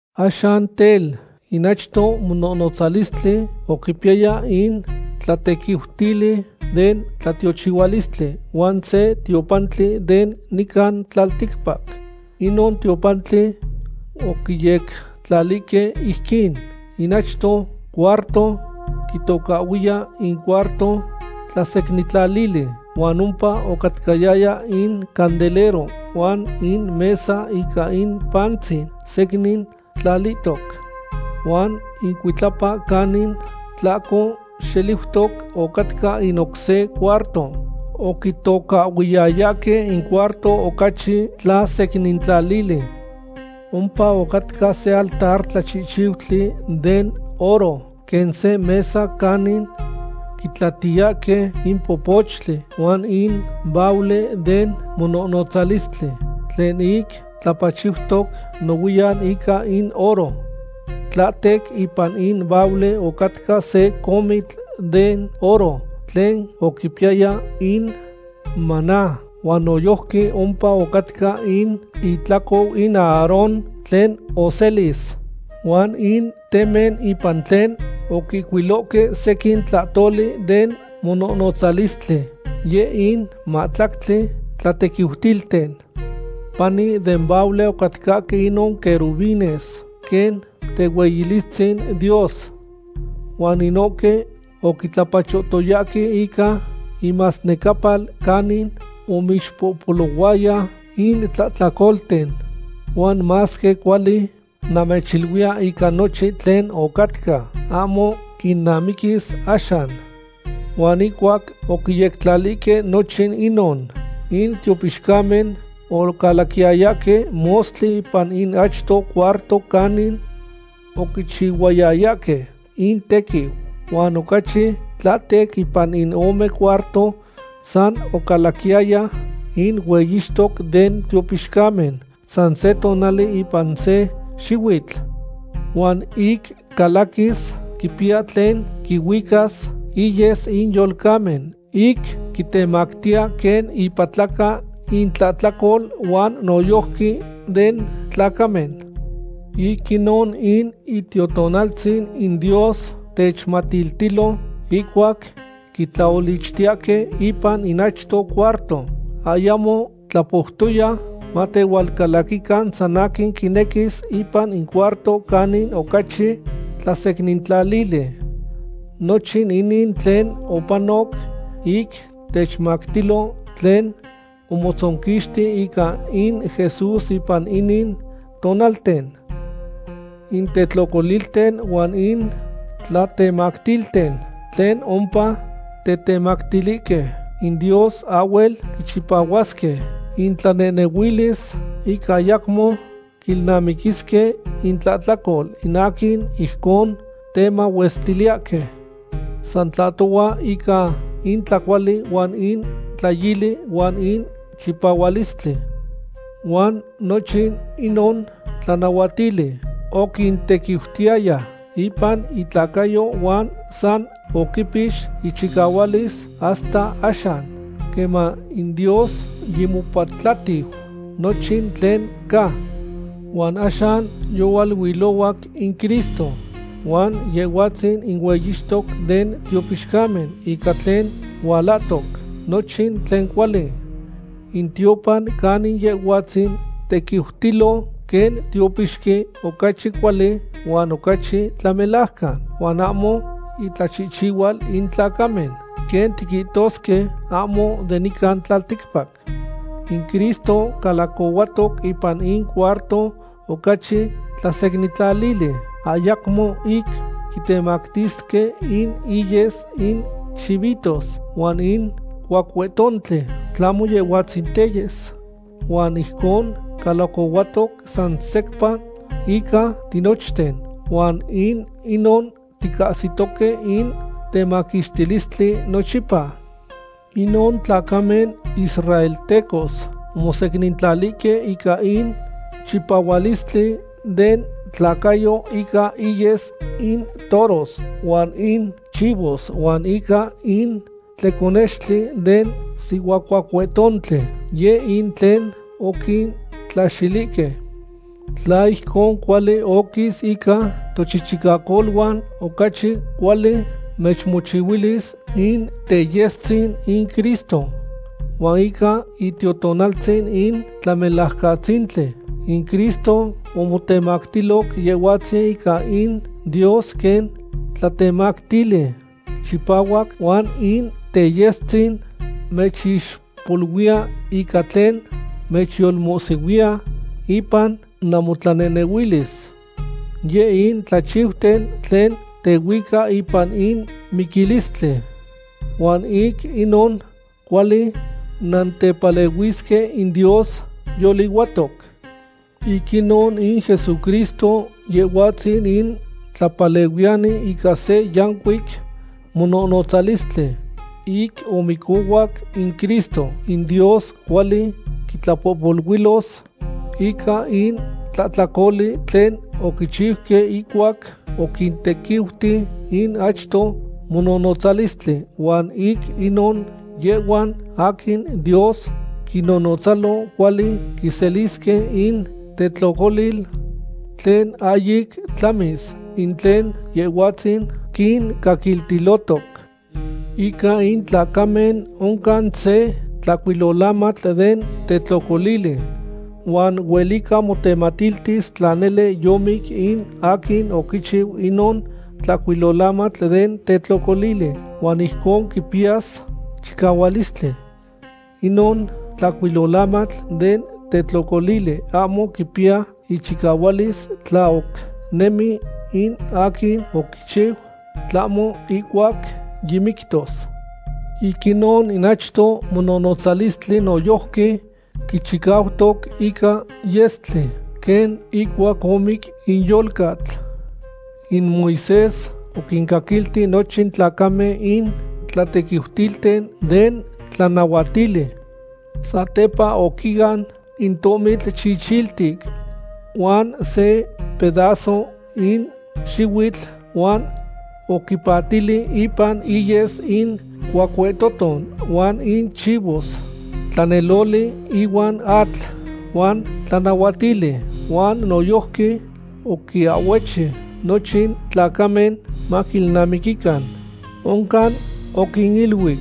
Axan tel, in achto mononotzalistli oquipiyaya in tlatequiutili den tlaolichtilistli, huan se tiopantli de nican tlalticpac. Inon tiopantli oquiyectlalihque ijquin. In achto cuarto quitocahhuiya in cuarto tlasecnintlalili huan ompa ocatcayaya in candelero huan in mesa ica in pantzin secnin tlalihtoc. Huan icuitlapa canin tlahco xeliutoc ocatca in oc se cuarto oquitocahhuiyayahque in cuarto ocachi tlasecnintlalili. Ompa ocatca se altar tlachihchiutli den oro quen se mesa canin quitlatiyahque in popochtli, huan in baule den mononotzalistli, tlen ic tlapachiutoc nohuiyan ica in oro. Tlahtec ipan in baule ocatca se comitl den oro tlen oquipiyaya in maná, huan noyojqui ompa ocatca in itlacou in Aarón tlen oselix, huan in temen ipan tlen oquihcuiloque sequin tlahtoli den mononotzalistli, yeh in matlactli tlatequiutilten. Pani den baule ocatcahque inon querubines quen tehueyilistzin Dios. Huan inohque oquitlapachohtoyahque ica inmasnecapal canin omixpohpolohuaya in tlahtlacolten. Huan masque cuali namechiluiya ica nochin tlen ocatca, ahmo quinamiquis axan. Huan ihcuac oquiyectlalihque nochin inon, in tiopixcamen ocalaquiyayahque mostli ipan in achto cuarto canin oquichihuayayahque intequiu. Huan ocachi tlahtec ipan in ome cuarto san ocalaquiyaya in hueyixtoc den tiopixcamen san se tonali ipan se xihuitl. Huan ic calaquis, quipiya tlen quihuicas, iyes in yolcamen ic quitemactiya quen ipatlaca in itlahtlacol huan noyojqui den tlacamen. Ic inon in Itiotonaltzin in Dios techmatiltilo, ihcuac quitlaolichtiyahque ipan in achto cuarto, ayamo tlapoutoya matehualcalaquican san aquin quinequis ipan in cuarto canin ocachi tlasecnintlalili. Nochin inin tlen opanoc ic techmatiltilo tlen omotzonquixti ica in Jesús ipan inin tonalten. In tetlocolilten huan in tlatemactilten tlen ompa tetemactilihque in Dios ahhuel quichipahuasque intlanehnehuilis ic ayacmo quilnamiquisque intlahtlacol in aquin ijcon temahuestiliyahque. San tlahtohua ica in tlacuali huan in tlayili huan in chipahualistli. Huan nochin inon tlanahuatili oquintequiutiyaya ipan intlacayo huan san oquipix ichicahualis hasta axan queman in Dios yimopatlatiu nochin tlen ca. Huan axan yohualuilohuac in Cristo huan Yehhuatzin in hueyixtoc den tiopixcamen ica tlen hualahtoc, nochin tlen cuali. In tiopan canin Yehhuatzin tequiutilo quen tiopixqui ocachi cuali huan ocachi tlamelajcan, huan ahmo intlachihchihual in tlacamen, quen tiquihtosque, ahmo de nica tlalticpac. In Cristo calacohuatoc ipan in cuarto ocachi tlasecnintlalili, ayacmo ic quitemactisque in iyes in chivitos huan in cuacuetontli, tlahmo Yehhuatzin teyes. Huan ijcon calacohuatoc san secpa ica tinochten, huan ic inon ticahsitoque in temaquixtilistli nochipa. Inon tlacamen israeltecos omosecnintlalihque ica in chipahualistli den tlacayo ica iyes in toros huan in chivos huan ica in tleconextli den sihuacuacuetontli, yeh in tlen oquintlaxilihque. Tla ijcon cuali oquis ica tochichicacoluan, ocachi cuali mechmochihuilis in teyestzin in Cristo. Huan ica Itiotonaltzin in Tlamelajcatzintli, in Cristo omotemactiloc Yehhuatzin ica in Dios quen tlatemactili chipahuac huan in teyestzin mechixpoluiya ica tlen mechyolmohsihuiya ipan namotlanehnehuilis. Yeh in tlachiuten tlen tehuica ipan in miquilistli. Huan ic inon, cuali nantepalehuisque in Dios yolihuatoc. Ic inon in Jesucristo Yehhuatzin in Tlapalehuiyani ica se yancuic mononotzalistli. Ic omicohuac in Cristo, in Dios cuali quintlapohpoluilos ica in tlahtlacoli tlen oquichiuque ihcuac oquintequiuti in achto mononotzalistli, huan ic inon yehhuan aquin Dios quinnotzalos cuali quiselisque in tetlocolil tlen ahyic tlamis, in tlen Yehhuatzin quincaquiltilotoc. Ica in tlacamen oncan se tlahcuilolamatl den tetlocolili. Huan huelica motematiltis tla nele yomic in aquin oquichiu inon tlahcuilolamatl den tetlocolili, huan ijcon quipiyas chicahualistli. Inon tlahcuilolamatl den tetlocolili ahmo quipiya ichicahualis tla oc nemi in aquin oquichiu, tlahmo ihcuac yimictos. Ic inon in achto mononotzalistli noyojqui quichicautoc ica yestli quen ihcuac omic in yolcatl. In Moisés oquincaquilti nochin tlacamen in tlatequiutilten den tlanahuatili. Satepa oquian in tohmitl chichiltic huan se pedazo in xihuitl huan oquipatili ipan iyes in cuacuetoton huan in chivos, tlaneloli ihuan atl, huan oquiahhuechi in amatl den tlanahuatili huan noyojqui oquinahhuechi nochin tlacamen maquiilnamiquican. Oncan oquiniluic: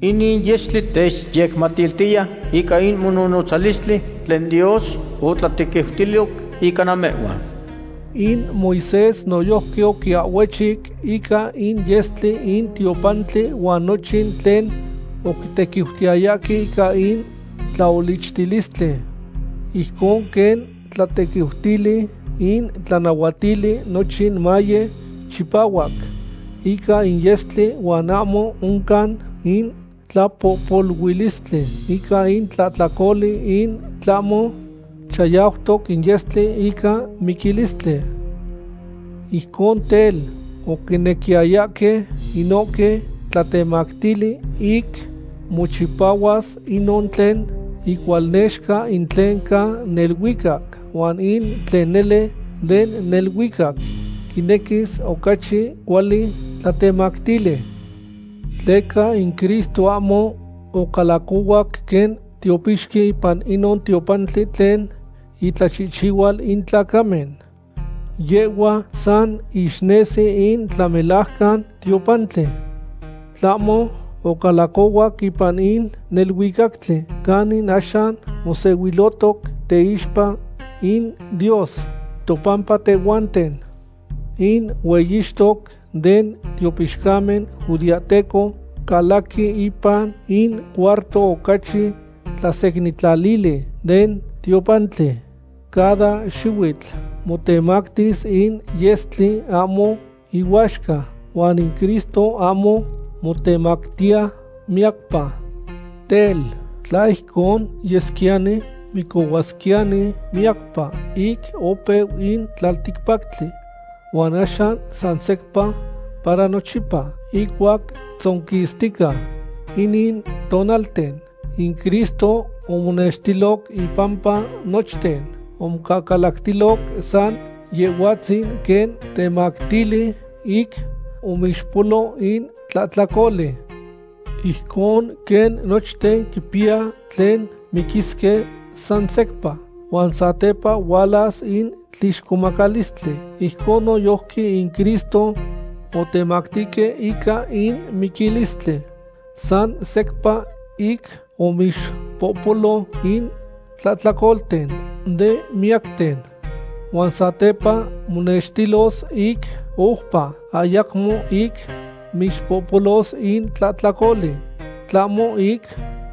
“Inin yestli techyecmatiltiya ica in mononotzalistli tlen Dios otlatequiutiloc ica namehhuan.” In Moisés noyojqui oquiahhuechic ica in yestli in tiopantli huan nochin tlen oquitequiutiyayahque ica in tlaolichtilistli. Ijcon quen tlatequiutili in tlanahuatili, nochin maye chipahuac ica in yestli, huan ahmo oncan in tlapohpoluilistli ica in tlahtlacoli in tlahmo chayautoc in yestli ica miquilistli. Ijcon tel, oquinequiyayahque inohque tlatemactili ic mochipahuas inon tlen icualnexca in tlen ca neluicac. Huan in tlen nele den neluicac quinequis ocachi cuali tlatemactili. Tleca in Cristo ahmo ocalacohuac quen tiopixqui ipan inon tiopantli tlen itlachihchihual in tlacamen. Yehhua san ixnesi in tlamelajcan tiopantli. Tlahmo ocalacohuac ipan in neluicactli, canin axan monextilotoc teixpa in Dios topampa tehhuanten. In hueyixtoc den tiopixcamen judeahteco calaqui ipan in cuarto ocachi tlasecnintlalili den tiopantli cada xihuitl motemactis in yestli ahmo ihuaxca, huan in Cristo ahmo motemactiya miyacpa. Tel, tla ijcon yesquiyani, micohuasquiyani miyacpa ic opeu in tlalticpactli. Huan axan san secpa para nochipa ihcuac tzonquixtica inin tonalten, in Cristo omonextiloc impampa nochten, omocahcalactiloc san Yehhuatzin quen temactili ic omixpohpolo in tlahtlacoli. Ijcon quen nochten quipiya tlen miquisque san secpa, huan satepa hualas in tlixcomacalistli, ijcon noyojqui in Cristo otetemactihque ica in miquilistli san secpa ic omixpohpolo in tlahtlacolten de miyacten. Huan satepa monextilos ic oupa, ayacmo ic mixpohpolos in tlahtlacoli, tlahmo ic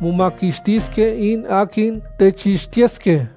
momaquixtisque in aquin techixtiyesque.